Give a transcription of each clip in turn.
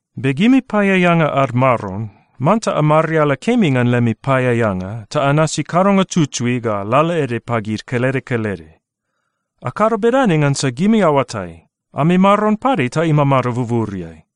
Be gimi paeaeanga ad maron, manta amariala kemi ngan lemi paeaeanga, ta anasi kadonga tutui ga lalaede pagid kelede kelede. Akado bedane ngansa gimi aoatai, ami Maron pade ta imamado buburiai.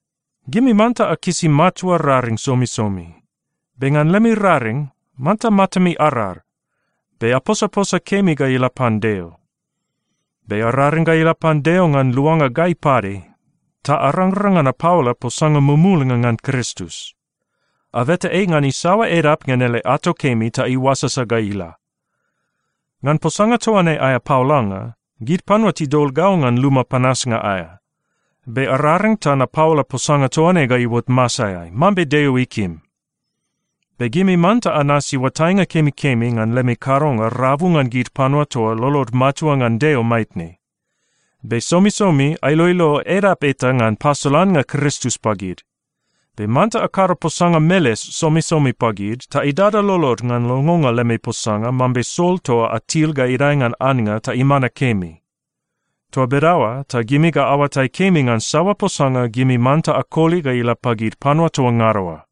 Gimi manta akisi matua raring somisomi. Be ngan lemi raring, manta matami arar, be aposaposa kemi ga ila pan Deo. Be araring ga ila pan Deo ngan luanga gai pade ta arangrang ngan apaola posanga mumulnga ngan Kristus. Abeta ei ngan isaoa edap ngan ele ato kemi ta iuasasa ga ila. Ngan posanga toa ne aea paolanga, gid panua tidol gau ngan luma panasnga aea. Be araring ta napaola posanga toa ne ga iuot masaeai mambe Deo ikim. Be gimi manta anasi oatainga kemikemi ngan lemi kadonga rabu ngan gid panua toa lolod matua ngan Deo maitne. Be somisomi ailoilo edap eta ngan pasolannga Kristus pagid. Be manta akado posanga meles somisomi pagid, ta idada lolod ngan longonga lemi posanga mambe sol toa atil ga idae ngan annga ta imana kemi. Toa bedaoa ta gimi ga aoatai kemi ngan saoa posanga gimi manta akoli ga ila pagid panua toa ngada oa.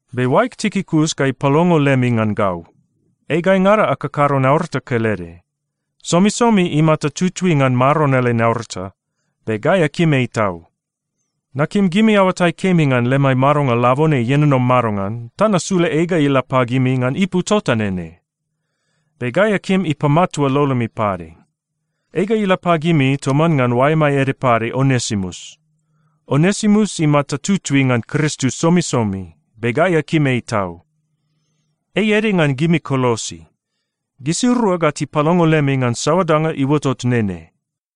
Be oaeg Tikikus ga ipalongo lemi ngan gau. Ei gaingada akakado naurata kelede. Somisomi imata tutui ngan Maron ele naurata, be gai akim ei tau. Nakim gimi aoatai kemi ngan lemai madonga labone ienono madongan ta nasula ei ga ila pagimi ngan ipu tota nene. Be gai akim ipamatua lolomi pade. Ei ga ila pagimi toman ngan oaemai ede pade Onesimus. Onesimus imata tutui ngan Kristus somisomi, be gai akim ei tau. Ei ede ngan gimi Kolosi. Gisirua ga tipalongo lemi ngan saoa danga iuotot nene.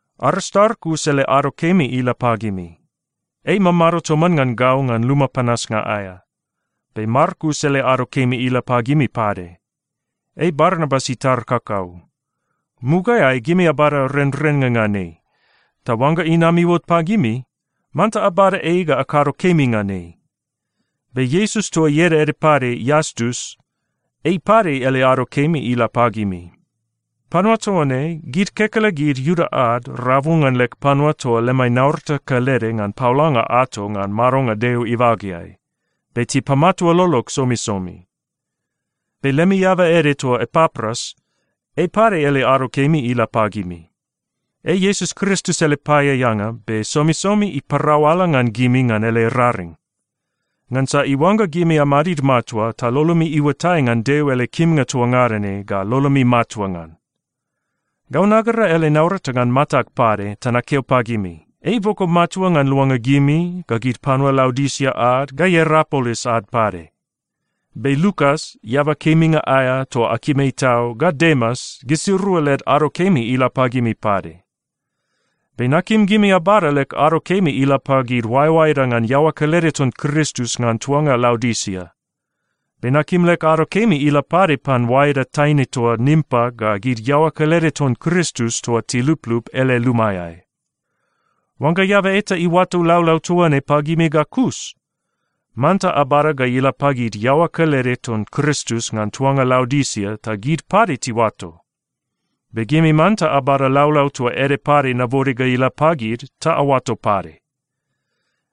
Aristarkus ele ado kemi ila pagimi. Ei imamado toman ngan gau ngan luma panasnga aea. Be Markus ele ado kemi ila pagimi pade. Ei Barnabas itar kakau. Mugaeai, gimi abada renrennga ngan ei, ta oangga inam iuot pagimi, manta abada ei ga akado kemi ngan ei. Be Iesus toa ieda ede pade Iastus, ei pade ele ado kemi ila pagimi. Panua toa ne, gid kekelegid Iuda ad rabu ngan leg panua toa lemai naurata kelede ngan paolanga ato ngan madonga Deo ibageai, be tipamatua lolog somisomi. Be lemi eaba ede toa Epapras, ei pade ele ado kemi ila pagimi. Ei Iesus Kristus ele paeaeanga be somisomi iparau ala ngan gimi ngan ele raring, ngansa iuangga gimi amadid matua ta lolomi iuatai ngan Deo ele kimnga toa ngada ne ga lolomi matua ngan. Gau nagera ele naurata ngan matag pade ta nakeo pagimi, ei iboko matua ngan luanga gimi, ga gid panua Laodisia ad, ga Ierapolis ad pade. Be Lukas, eaba keminga aea toa akim ei tau, ga Demas, gisirua led ado kemi ila pagimi pade. Be nakim gimi abada leg ado kemi ila pagid oaeoaeda ngan iaoa kelede ton Kristus ngan tuanga Laodisia. Be nakim leg ado kemi ila pade pan oaeda taine toa Nimpa ga gid iaoa kelede ton Kristus toa tiluplup ele lumaeai. Oangga eaba eta iuato laulau toa ne pagimi ga kus, manta abada ga ila pagid iaoa kelede ton Kristus ngan tuanga Laodisia ta gid pade tiuato. Be gimi manta abada laulau toa ede pade nabode ga ila pagid ta aoato pade.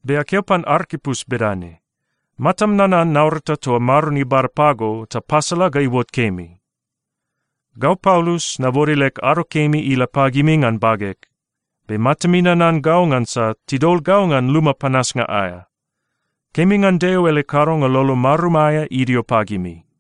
Be akeo pan Arkipus bedane, “Matam nanan naurata toa Maron ibada pago ta pasala ga iuot kemi.” Gau Paulus, nabode leg ado kemi ila pagimi ngan bageg. Be matami nanan gau ngansa tidol gau ngan luma panasnga aea. Kemi ngan Deo ele kadonga lolo marum aea idio pagimi.